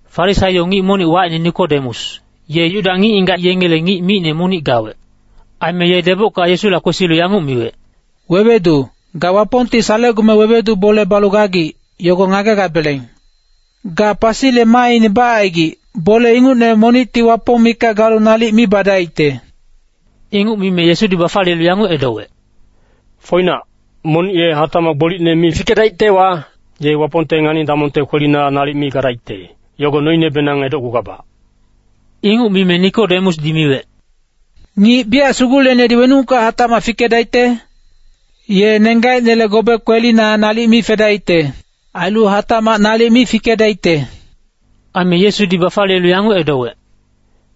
Farisaio ngic monic wacine Nikodemus, ye Yuda ngic-ngigac yengele ngic micne monic gawec. Aime ye debocka Yesula kwesilu yanguc miwec, “Wewedu, ga Wapongti salecgume wewedu bole balu gagic, yogo ngagegabeleng. Ga pasile maaine bacaigic, bole ingucne monicti Wapong mikac galu nalic mi badaicte.” Inguc mime Yesudi bafaliyelu yanguc edowec, “Foinac, monic ye hatacmac gbolicne mi fikedaictewa, ye Wapongte ngani-damongte kwelina nalic mi gadaicte, yogo noinebenang edocgugabac.” Inguc mime Nikodemusdi miwec, “Ngic biyac suguleicnedi wenucka hatacmac fikedaicte? Ye nenggacinele gobe kwelina nalic mi fedaicte. Ailu hatacmac nalic mi fikedaicte.” Aime Yesudi bafaliyelu yanguc edowec,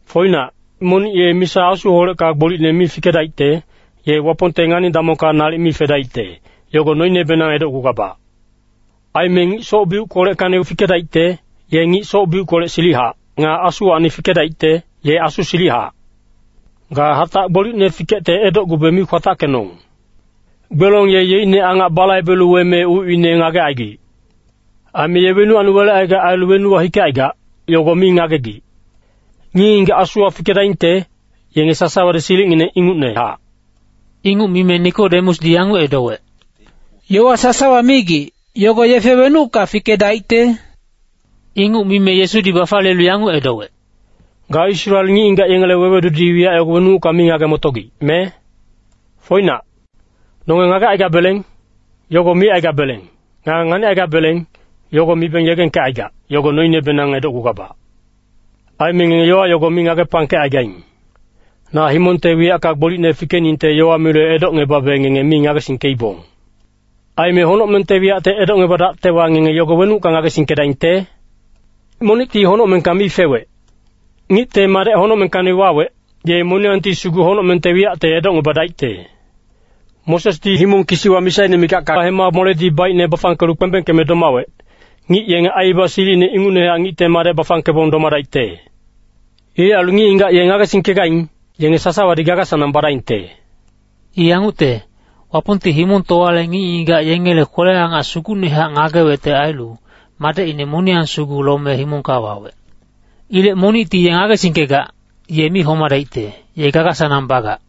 “Foinac, monic ye misa Asuholecka gbolicne mi fikedaicte, ye Wapongte ngani-damongka nalic mi fedaicte, yogo noinebenang edocgugabac. Aime ngic soc-biuckoleckacni fikedaicte, ye ngic soc-biuckolec silichac. Nga Asuwacni fikedaicte, ye Asu silichac. Ga hatac gbolicne fikecte edocgube mi kwatackenong. Gbelong ye yeicne angac balaibelu weme ucine ngagecaigic. Aime ye wenuwacni welecaigac ailu wenuwa hikecaigac, yogo mi ngagegic. Ngic-ngigac Asuwa fikedaingte, yenge sasawadi silicngineng ingucnehac.” Inguc mime Nikodemusdi yanguc edowec, “Yowa sasawa migic, yogo yefe wenucka fikedaicte?” Inguc mime Yesudi bafaliyelu yanguc edowec, “Ga Israel ngic-ngigac yengele wewedudi wiyac yogo wenucka mi ngage-motogic, me? Foinac, nonge ngagecaigabeleng, yogo micaigabeleng. Nga nganicaigabeleng, yogo mibeng yegengkecaigac, yogo noinebenang edocgugabac. Aime ngenge yowa yogo mi ngagepangkecaigaing. Na himongte wiyacka gbolicne fikeningte yowa milu edocngebabe ngenge mi ngagesingkeibong. Aime honocmengte wiyacte edocngebadactewa, ngenge yogo wenucka ngagesingkedaingte? Monicti honocmengka mi fewec. Ngicte Madec honocmengkacni wawec, ye moniyangti sugu honocmengte wiyacte edocngebadaicte. “Mosesdi himong kisiwa misaine mikacka hema moledi baicne bafangkelu kpembengkeme domawec, ngic yenge aibaba silicine ingucnehac Ngicte Madec bafangkebong domadaicte. Ilec ailu ngic-ngigac ye ngagesingkegaing, yenge sasawadi gaga-sanang badaingte.” I yangucte, Wapongti himongtowale ngic-ngigac yengele kwele-angac sugucnehac ngagewecte ailu, Madecine moniyang sugu lome himongka wawec. Ilec monicti ye ngagesingkegac, ye mi homadaicte, ye gaga-sanang bagac.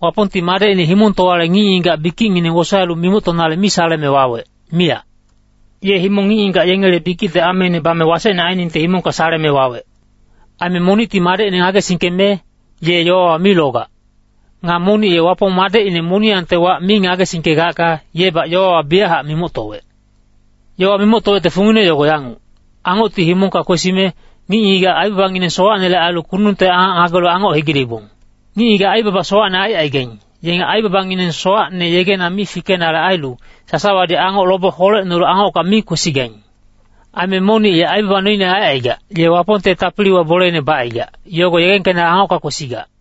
Wapongti Madecine himongtowale ngic-ngigac bikicngineng wosaelu mimoctonale mi saleme wawec, miyac. Ye himong ngic-ngigac yengele bikicte ameine bame wasecne ainingte himongka saleme wawec. Aime monicti Madecine ngagesingkeme, ye yowawa mi logac. Nga monic ye Wapong Madecine moniyangte wac mi ngagesingkegacka, yebac yowawa biyachac mimoctowec. Yowa mimoctowecte fungine yogo yanguc, Angocti himongka kwesime, ngic-ngigac aibabangineng sowacnele ailu kundungte angac ngagelu Angoc hegileibong. Ngic-ngigac aibaba sowacne aicaigaing, yenge aibabangineng sowacne yegena mi fikenale ailu, sasawadi Angoc lobe holecnolu Angocka mi kwesigaing. Aime monic ye aibaba noine aicaigac, ye Wapongte tapiliwa boleine bacaigac, yogo yegengkenale Angocka kwesigac.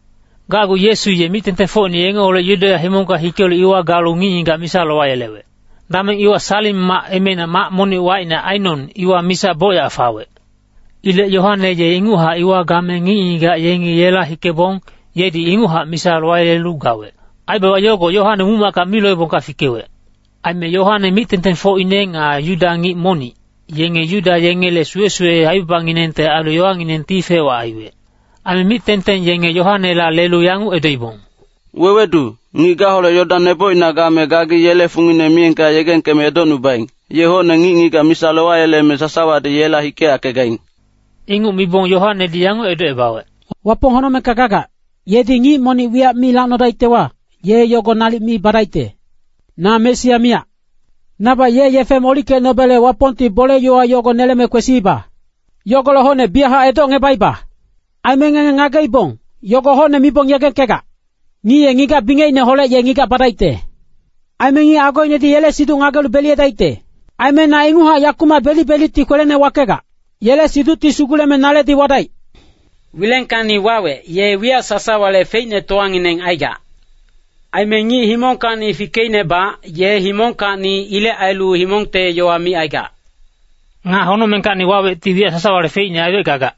Gacgu Yesu ye mic-tengtengfocine yengeholec Yudeya himongka hikelu iwa galu ngic-ngigac misa lowayelewec. Dameng iwa Salim mac emeina mac monic wacine Ainon, iwa misa bocyac fawec. Ilec Yoane ye inguchac iwa game ngic-ngigac yenge yela hikebong, yedi inguchac misa lowayelelu gawec. Aibaba yogo Yoane muc-macka mi loebongka fikewec. Aime Yoane mic-tengtengfocine nga Yuda ngic monic, yenge Yuda yengele suwe-suwe aibabanginengte ailu yowanginengti fec-wac aiwec. Aime mic-tengteng yenge Yoanela lelu yanguc edoibong, “Wewedu, ngic gaholec Yodan nebocina game gagi yele fungine miyengka yegengkeme edocnubaing, ye hocne ngic-ngigac misa lowayeleme sasawadi yela hikeyackegaing.” Inguc mibong Yoanedi yanguc edocebawec, “Wapong honocmengka gagac, yedi ngic monic wiyac mi lacnodaictewa, ye yogo nalic mi badaicte. Na Mesia miyac. Nabac ye yefe molickecnobele Wapongti bole-yowa yogo neleme kwesiiba. Yogolec hocne biyachac edocngebaiba. Aime ngenge ngageibong, yogo hocne mibong yegengkegac. ‘Ngic ye ngigac bingecineholec ye ngigac badaicte. Aime ngic agoinedi yele siduc ngagelu beliyedaicte.’ Aime na ingucnehac yakumac belic-belicti kwelene wakegac. Yele siducti suguleme naledi wadaic.” Wilengkacni wawec, ye wiyac sasawale feicnetowangineng aigac. Aime ngic himongkacni fikeicnebac, ye himongkacni. Ilec ailu himongte yowa micaigac. Nga honocmengkacni wawecti wiyac sasawale feicne aiwec gagac.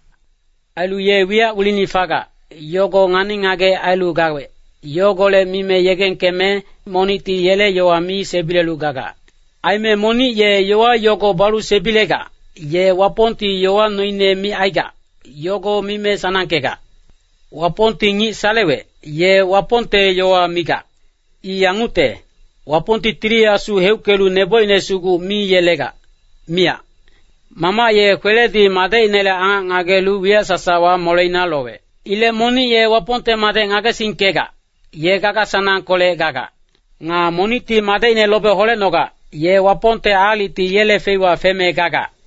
Ailu ye wiyac wilini fagac, yogo ngani-ngagec ailu gawec, yogolec mime yegengkeme, monicti yele yowa mi sebilelu gagac. Aime monic ye yowa yogo balu sebilegac, ye Wapongti yowa noine micaigac, yogo mime sanangkegac. Wapongti ngic salewec, ye Wapongte yowa migac. I yangucte, Wapongti Tili Asu heuckelu nebocine sugu mi yelegac, miyac. Mamac ye kweledi Madecinele angac ngagelu wiyac sasawa moleina lowec. Ilec monic ye Wapongte Madec ngagesingkegac, ye gaga-sanangkolec gagac. Nga monicti Madecine lobe holecnogac, ye Wapongte aalicti yele feiwa feme gagac.